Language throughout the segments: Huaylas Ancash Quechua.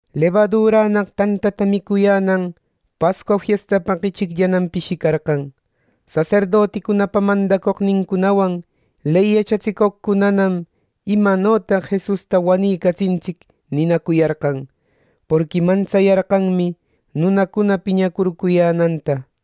Lebadurannaq tantata micuyänan Pascua fiestapaq ichicllanam pishicarqan. Saserdoticunapa mandacoqnincunawan, ley yachatsicoqcunanam, “¿imanotaq Jesusta wanicatsintsic?” ninacuyarqan, porqui mantsayarqanmi nunacuna piñacurcuyänanta.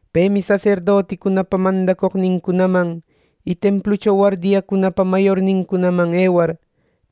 Pemi saserdoticunapa mandacoqnincunaman y templucho wardiacunapa mayornincunaman ewar,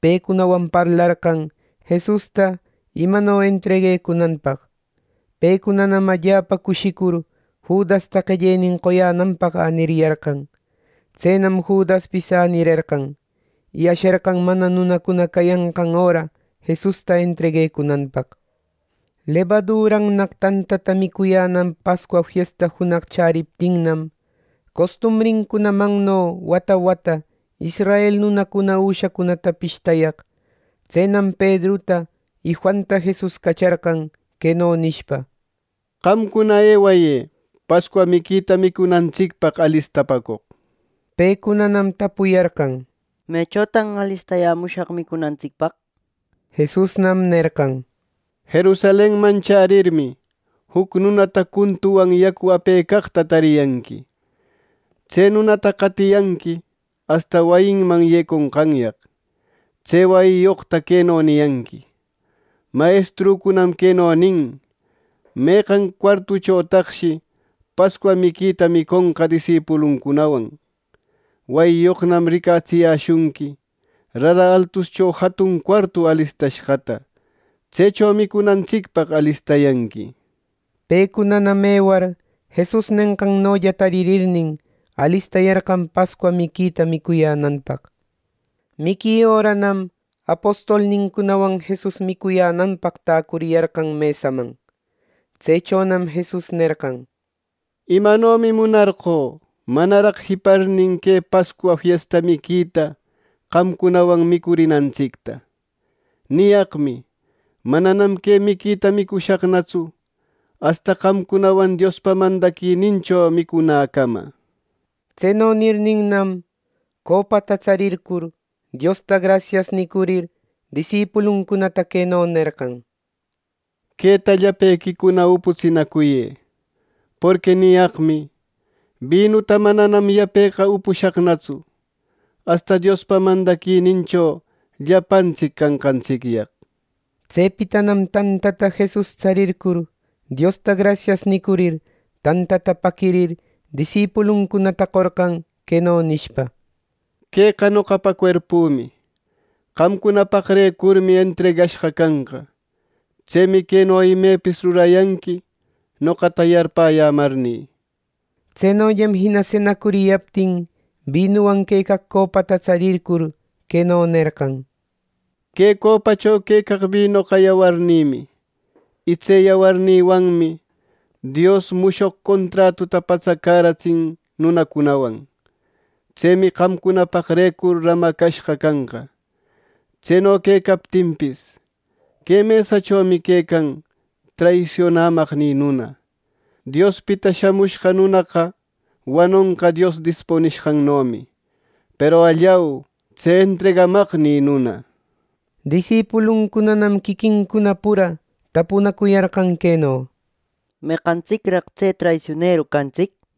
pecunawan parlarqan Jesusta imano entreguecunanpaq. Pecunanam allapa cushicur Judasta qellenin qoyänanpaq äniriyarqan. Tsenam Judaspis änirerqan, y asherqan mana nunacuna cayanqan öra Jesusta entreguecunanpaq. Lebadurannaq tantata micuyänan Pascua fiesta junaq chäriptinnam, costumbrincunamanno wata wata israel nunacuna üshacunata pishtayaq. Tsenam Pedruta y Juanta Jesus cacharqan, queno nishpa: —Qamcuna, ewayë Pascua miquita micunantsicpaq alistapäcoq —nir. Pecunanam tapuyarqan: —¿Mechotan alistayämushaq micunantsicpaq? —nishpa. Jesusnam nerqan: —Jerusalenman chärirmi, juc nunata cuntuwan, yacuta apecaqta tariyanqui. Tse nunata qatiyanqui asta wayiman yeconqanyaq. Tse wayiyoqta queno niyanqui: ‘Mayestrücunam queno nin: ¿Meqan cuartuchotaqshi Pascua miquita miconqa disipuluncunawan?’ Wayiyoqnam ricatsiyäshunqui rara altuscho jatun cuartu alistashqata. Tsecho micunantsicpaq alistayanqui. Pecunanam ewar Jesus nenqannolla tarirnin, alistayarqan Pascua miquita micuyänanpaq. Miqui öranam apostolnincunawan Jesus micuyänanpaq täcuriyarqan mesaman. Tsechonam Jesus nerqan: —Imanomi munarqö manaraq jiparnin que Pascua fiesta miquita qamcunawan micurinantsicta. Niyaqmi: Mananam que miquita micushaqnatsu asta qamcunawan Diospa mandaquinincho micunäcama. Tseno nirninnam, copata tsarircur, Diosta, “Grasias” nicurir, disipuluncunata queno nerqan: —Queta llapequicuna uputsinacuyë. Porqui niyaqmi: Binuta mananam yapeqa upushaqnatsu asta Diospa mandaquinincho llapantsic canqantsicyaq. Tsepitanam tantata Jesus tsarircur Diosta “Grasias” nicurir tantata paquirir, disipuluncunata qorqan, queno nishpa: —Queqa noqapa cuerpümi. Qamcunapaqrecurmi entregashqa canqa. Tsemi queno imepis rurayanqui, noqata yarpäyämarnï. Tsenollam jina senacuriyaptin, binuwan quecaq copata tsarircur, queno nerqan: —Que copacho quecaq binoqa yawarnïmi; y tse yawarnïwanmi Dios mushoq contratuta patsacäratsin nunacunawan. Tsemi qamcunapaqrecur ramashqa canqa. Tseno quecaptinpis, que mesachomi quecan traisionamaqnï nuna. Diospita Shamushqa Nunaqa wanonqa Dios dispunishqannomi; peru ¡allau, tse entregamaqnï nuna! Disipuluncunanam quiquincuna pura tapunacuyarqan queno: —¿Meqantsicraq tse traisioneru cantsic? —nishpa.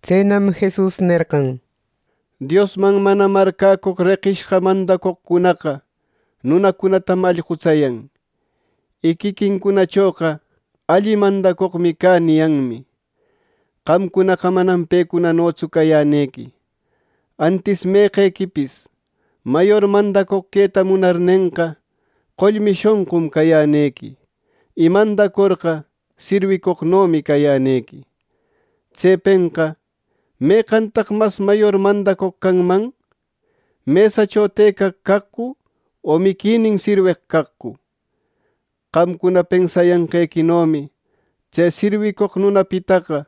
Tsenam Jesus nerqan: “Diosman mana marcäcoq reqishqa mandacoqcunaqa nunacunatam allqutsayan; y quiquincunachoqa ‘Alli mandacoqmi cä’ niyanmi. Qamcunaqa manam pecunanotsu cayänequi. Antis meqequipis mayor mandacoq queta munarnenqa, qollmi shonqum cayänequi. Y mandacorqa, sirwicoqnomi cayänequi. Tsepenqa ¿meqantaq mas mayor mandacoq canman? ¿Mesacho tëcaq caqcu o miquinin sirweq caqcu? Qamcuna pensayanqequinomi tse sirwicoq nunapitaqa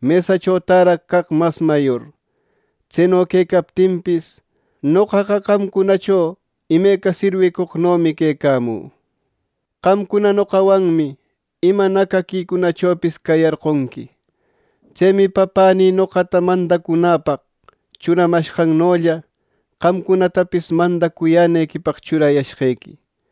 mesacho täraq caq mas mayor. Tseno quecaptinpis, noqaqa qamcunacho imeca sirwicoqnomi quecamü. “Qamcuna noqawanmi ima nacaquinïcunachopis cayarqonqui. Tsemi Papänï noqata mandacunäpaq churamanqannolla, qamcunatapis mandacuyänequipaq churayashqequi.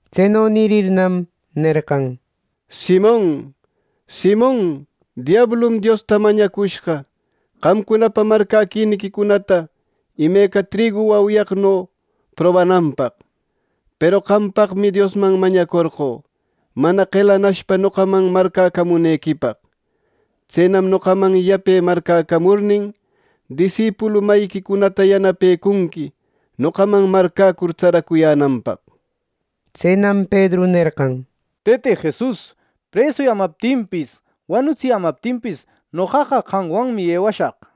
Tseno nirirnam, nerqan: —Simon, Simon, diablum Diosta mañacushqa, qamcunapa marcäquiniquicunata imeca trigu wauyaqno probananpaq. Peru qampaqmi Diosman mañacorqö mana qelanashpa noqaman marcäcamunequipaq. Tsenam noqaman yape marcäcamurnin, disipulu mayiquicunata yanapëcunqui noqaman marcäcur tsaracuyänanpaq. Tsenam Pedru nerqan: —Tëte Jesus, presuyämaptinpis, wanutsiyämaptinpis, noqaqa qamwanmi ewashaq.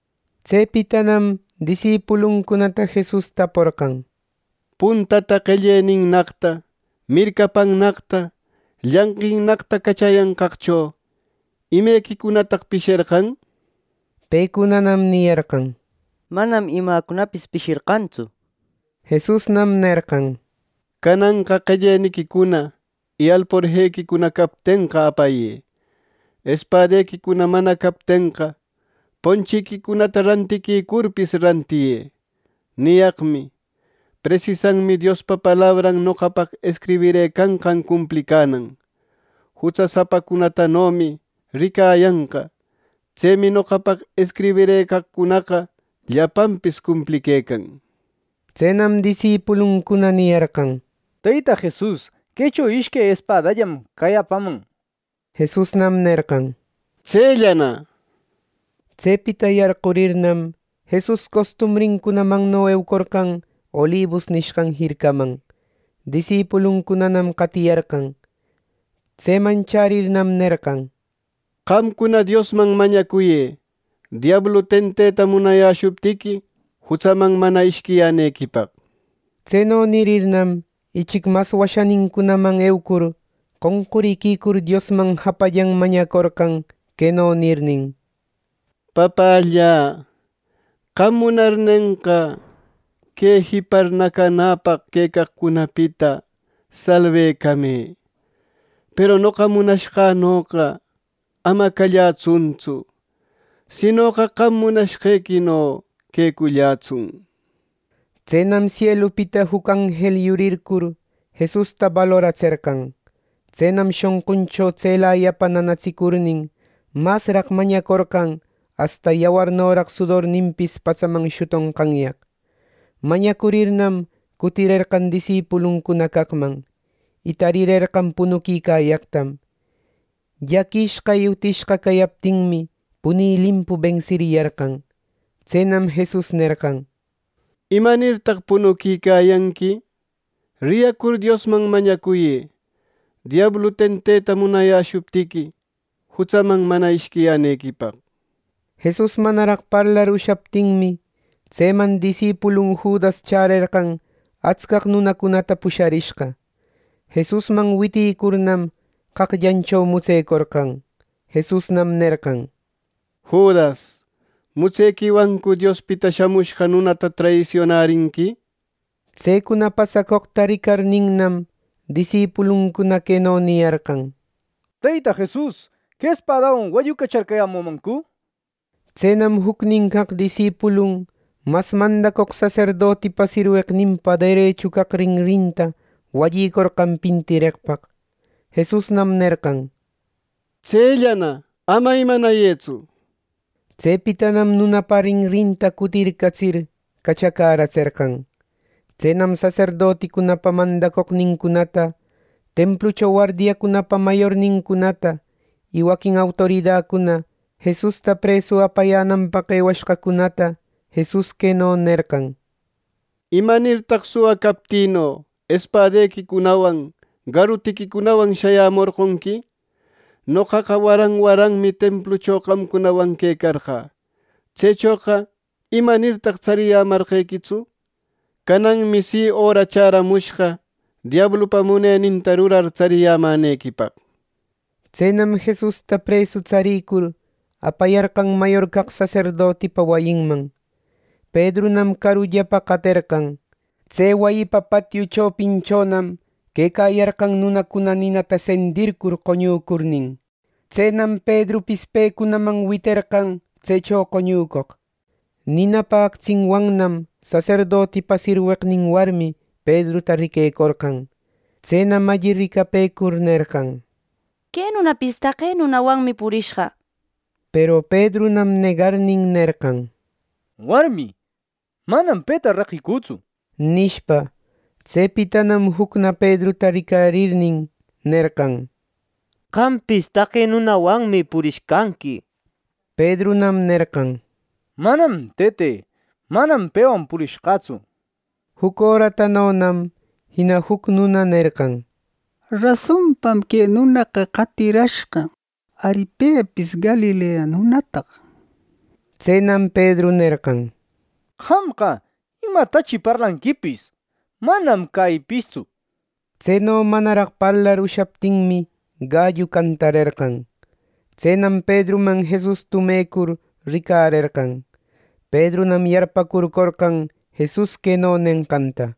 Tsepitanam disipuluncunata Jesus taporqan: —Puntata qellennaqta, mircapannaqta, llanqinnaqta cachayanqaqcho, ¿imequicunataq pisherqan? —nir. Pecunanam niyarqan: —Manam imacunapis pisherqantsu —nishpa. Jesusnam nerqan: —Cananqa qelleniquicuna y alporjequicuna captenqa, apayë. Espadequicuna mana captenqa, ponchiquicunata rantiquicurpis, rantiyë. Niyaqmi: Presisanmi Diospa palabran noqapaq escribirëcanqan cumplicanan, ‘Jutsasapatanomi ricayanqa.’ Tsemi noqapaq escribirëcaqcunaqa llapanpis cumpliquecan. Tsenam disipuluncuna niyarqan: —Teyta Jesus, quecho ishque espadallam cayäpaman —nir. Jesusnam nerqan: —¡Tsellana! —nir. Tsepita yarqurirnam, Jesus costumbrinmanno eucorqan Olibus nishqan jircaman. Disipuluncunanam qatiyarqan. Tseman chärirnam, nerqan: —Qamcuna Diosman mañacuyë diablu tenteta munayäshuptiqui, jutsaman mana ishquiyänequipaq. Tseno nirirnam, ichic mas washanincunaman ewecur, qonquriquicur, Diosman japallan mañacorqan queno nirnin: —Papällä, qam munarnenqa, que jipar nacanäpaq quecaqcunapita salbecamë; peru noqa munashqänoqa ama callätsuntsu, sinoqa qam munashqequino quecullätsun —nir. Tsenam sielupita juc anjel yurircur, Jesusta baloratserqan. Tsenam shonquncho tselayapa nanatsicurnin, masraq mañacorqan asta yawarnoraq sudorninpis patsaman shutonqanyaq. Mañacurirnam cutirerqan disipuluncuna caqman, y tarirerqan punuquicayaqtam. Llaquishqa y utishqa cayaptinmi, puni limpu bensiyarqan. Tsenam Jesus nerqan: —¿Imanirtaq punucuyanqui? Riyacur Diosman mañacuyë diablu tenteta munayäshuptiqui, jutsaman mana ishquiyänequipaq. Jesus manaraq parlar ushaptinmi, tseman disipulun Judas chärerqan atscaq nunacunata pusharishqa. Jesusman witicurnam, qaqllancho mutsecorqan. Jesusnam nerqan: —Judas, ¿mutsequiwancu Diospita Shamushqa Nunata traisionarinqui? Tsecuna pasacoqta ricarninnam, disipuluncuna queno niyarqan: —Teyta Jesus, ¿que espadawan wallucacharcayämümancu? —nir. Tsenam jucnin caq disipulun mas mandacoq saserdotipa sirweqninpa derechu caq rinrinta wallicorqan pintireqpaq. Jesusnam nerqan: —¡Tsellana! ¡Ama imanayëtsu! Tsepitanam nunapa rinrinta cutircatsir, cachacäratserqan. Tsenam saserdoticunapa mandacoqnincunata, templucho wardiacunapa mayornincunata, y waquin autoridacuna Jesusta presu apayänanpaq ewashqacunata Jesus queno nerqan: —¿Imanirtaq suwa captïno espadequicunawan garutiquicunawan shayämorqonqui? Noqaqa waran waranmi templucho qamcunawan quecarqä. Tsechoqa ¿imanirtaq tsariyämarqequitsu? Cananmi si, öra chäramushqa diablupa muneninta rurar, tsariyämänequipaq. Tsenam Jesusta presu tsarïcur, apayarqan mayor caq saserdotipa wayinman. Pedrunam carullapa qaterqan. Tse wayipa patiu chopinchonam quecayarqan nunacuna ninata sendircur qoñucurnin. Tsenam Pedrupis pecunaman witerqan tsecho qoñücoq. Ninapa actsinwannam saserdotipa sirweqnin warmi Pedruta riquecorqan. Tsenam alli ricapëcur nerqan: —Que nunapis taqe nunawanmi purishqa. Peru Pedrunam negarnin nerqan: —Warmi, manam peta reqicütsu —nishpa. Tsepitanam jucna Pedruta ricarirnin nerqan: —Qampis taqe nunawanmi purishqanqui —nishpa. Pedrunam nerqan: —Manam, tëte. Manam pewan purishqätsu. Juc öratanonam jina juc nunana nerqan: —Rasonpam que nunaqa qatirashqa. ¡Ari, pepis Galilea nunataq! Tsenam Pedru nerqan: —Qamqa, ¿imatachi parlanquipis? ¡Manam cäyïpistsu! Tseno manaraq parlar ushaptinmi, gallu cantarerqan. Tsenam Pedruman Jesus tumecur, ricarerqan. Pedrunam yarparcurcorqan Jesus queno nenqanta: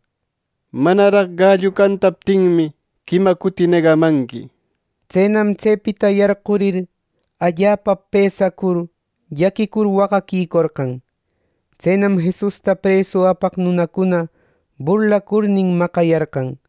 “Manaraq gallu cantaptinmi, quima cuti negamanqui.” Tsenam tsepita yarqurïcur allapa pësacur, llaquicur, waqaquicorqan. Tsenam Jesusta presu apaq nunacuna burlacurnin, maqayarqan.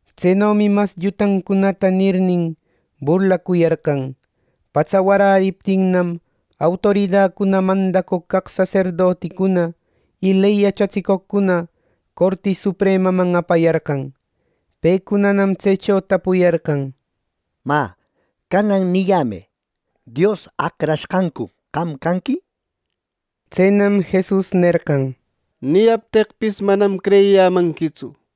Tsenomi mas llutancunata nirnin, burlacuyarqan. Patsa waräriptinnam, autoridacuna, mandacoq caq saserdoticuna y ley yachatsicoqcuna Corti Supremaman apayarqan. Pecunanam tsecho tapupäyarqan: —Mä, canan niyämë: ¿Dios Acrashqancu qam canqui? —nishpa. Tsenam Jesus nerqan: —Niyapteqpis, manam creyiyämanquitsu;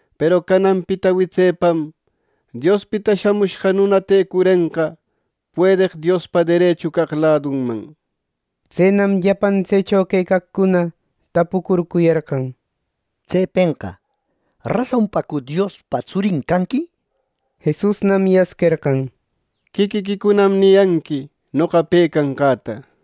Peru cananpita witsepam Diospita Shamushqa Nuna tëcurenqa puedeq Diospa derechu caq ladunman. Tsenam llapan tsecho quecaqcuna tapucurcuyarqan: —Tsepenqa ¿rasonpacu Diospa tsurin canqui? —nir. Jesusnam yasquerqan: —¡Quiquiquicunam niyanqui noqa pe canqäta!